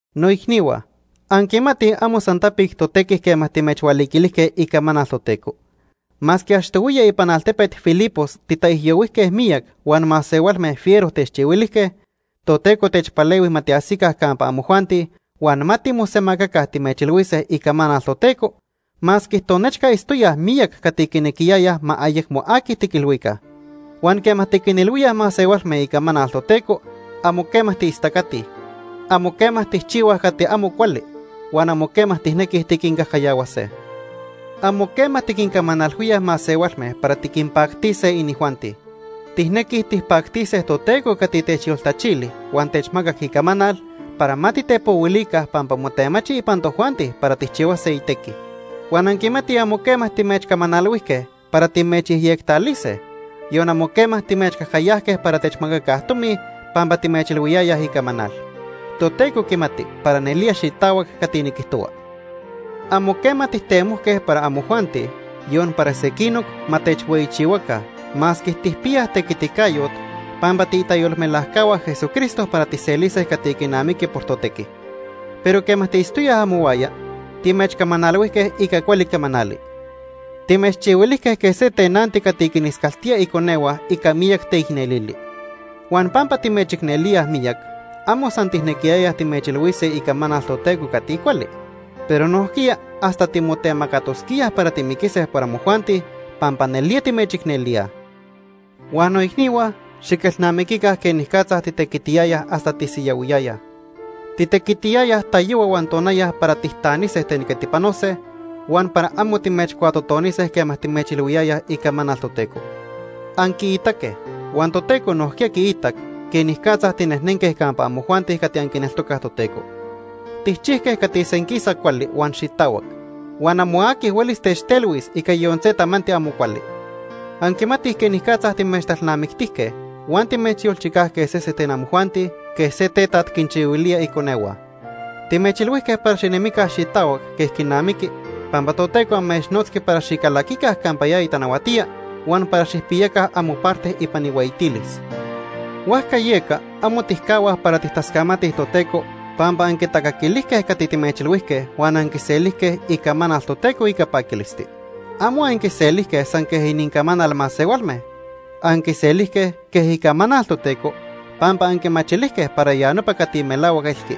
Noicnihua, anquimatij amo san tapic totequi quema timechhualiquilijque icamanal Toteco. Masque achtohuiya ipan altepet Filipos titaijyohuijque miyac huan masehualme fiero techchihuilijque, Toteco techpalehui ma tiajsica campa amojuanti huan ma timosemacaca timechilhuise icamanal Toteco masque tonechca itztoyaj miyac cati quinequiyayaj ma ayecmo aqui tiquilhuica. Huan quema tiquinilhuíaj masehualme icamanal Toteco, amo quema tiistacatij, amo quema tijchihuaj cati amo cuali, huan amo quema tijnequij tiquincajcayahuase. Amo quema tiquincamanalhuíaj masehualme para tiquinpactise inijuanti. Tijnequij tijpactise Toteco cati techyoltachili huan techmacac icamanal para ma titepohuilica pampa motemachi ipan tojuanti para tijchihuase itequi. Huan anquimatij amo quema timechcamanalhuijque para timechyejyectalise, yon amo quema timechcajcayajque para techmacaca tomi pampa timechilhuiyayaj icamanal. Toteco quimati para nelía xitahuac cati niquijtohua. Amo quema tijtemojque para amojuanti, yon para sequinoc, ma techhueyichihuaca, masque tijpiyaj tequiticayot pampa tiitayolmelajcahua Jesucristo para tijselise cati quinamiqui por totequi. Pero quema tiitztoyaj amohuaya, timechcamanalhuijque ica cuali camanali. Timechchihuilijque quej se tenanti cati quiniscaltía iconehua ica miyac teicnelili. Huan pampa timechicnelíaj miyac, amo san tijnequiyayaj timechilhuise icamanal Toteco cati cuali, pero nojquiya hasta timotemacatosquía para timiquise por amojuanti, pampa nelía timechicnelíaj. Huan noicnihua, xiquelnamiquica quenicatza titequitiyayaj hasta tisiyahuiyayaj. Titequitiyayaj tayohua huan tonaya para tijtanise ten ica tipanose huan para amo timechcuatotonise quema timechilhuiyayaj Icamanal Toteco. Anquiitaque huan Toteco nojquiya quiitac quenicatza tinejnenque campa amojuanti cati anquineltocaj Toteco. Tijchijque cati senquisa cuali huan xitahuac, huan amo aqui huelis techtelhuis ica yon se tamanti amo cuali. Anquimatij quenicatza timechtalnamictijque huan timechyolchicajque sese ten amojuanti quej se tetaj quinchihuilía iconehua. Timechilhuijque para xinemica xitahuac quej quinamiqui pampa Toteco amechnotzqui para xicalaquica campa yaya tanahuatía huan para xijpiyaca amoparte ipan ihueyitilis. Huajca yeca, amo tijcahuaj para tijtascamatij Toteco pampa anquitacaquilijque cati timechilhuijque huan anquiselijque icamanal Toteco ica paquilisti. Amo anquiselijque san quej inincamanal masehualme. Anquiselijque quej icamanal Toteco pampa anquimachilijque para ya nopa cati melahuac elqui.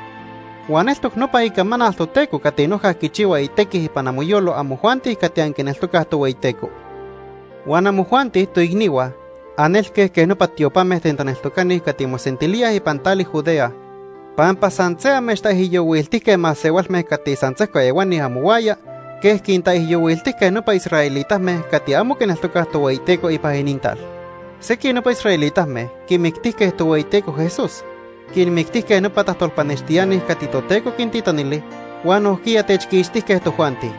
Huan eltoc nopa icamanal Toteco cati noja quichihua itequi ipan amoyolo amojuanti cati anquineltocaj Tohueyiteco. Huan amojuanti, toicnihua, anelque quej nopa tiopame ten taneltocani cati mosentilíaj ipan tali Judea pampa san se amechtaijyohuiltijque masehualme cati san sejco ehuani amohuaya quej quintaijyohuiltijque nopa israelitame cati amo quineltocaj Tohueyiteco ipan inintal. Sequij nopa israelitame quimictijque Tohueyiteco Jesús, quinmictijque nopa tajtolpanextiani cati Toteco quintitanili, huan nojquiya techquixtijque tojuanti.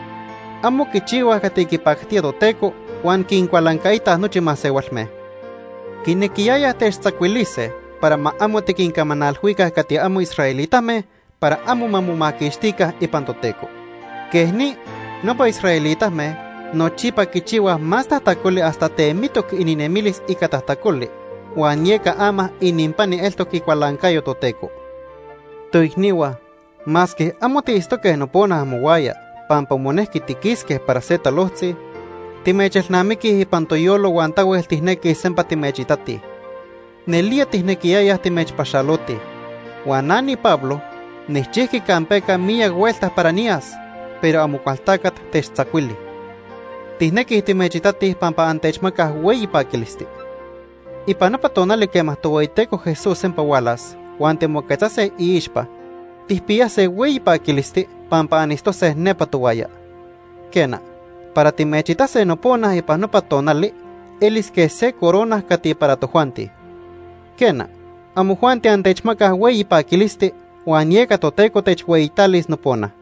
Amo quichihuaj cati quipactía Toteco huan quincualancaitaj nochi masehualme. Quinequiyayaj techtzacuilise para ma amo tiquincamanalhuica cati amo israelitame para amo ma momaquixtica ipan Toteco. Quej ni, nopa israelitame nochipa quichihuaj más tajtacoli hasta temitoc ininemilis ica tajtacoli, huan yeca ama ininpani eltoc icualancayo Toteco. Toicnihua, masque amo tiitztoque nopona amohuaya pampa monejqui tiquisque para se talojtzi, timechelnamiquij ipan toyolo huan tahuel tijnequij sempa timechitatij. Nelía tijnequiyayaj timechpaxalotij. Huan na niPablo nijchijqui campeca miyac huelta para niyas, pero Amocualtacat techtzacuili. Tijnequij timechitatij pampa antechmacaj hueyi paquilisti. Ipan nopa tonali quema Tohueyiteco Jesús sempa hualas, huan timoquetzase iixpa, tijpiyase hueyi paquilisti pampa anitztose nepa tohuaya. Quena, para timechitase nopona ipan nopa tonali elis quej se corona cati para tojuanti. Quena, amojuanti antechmacaj hueyi paquilisti huan yeca Toteco techhueyitalis nopona.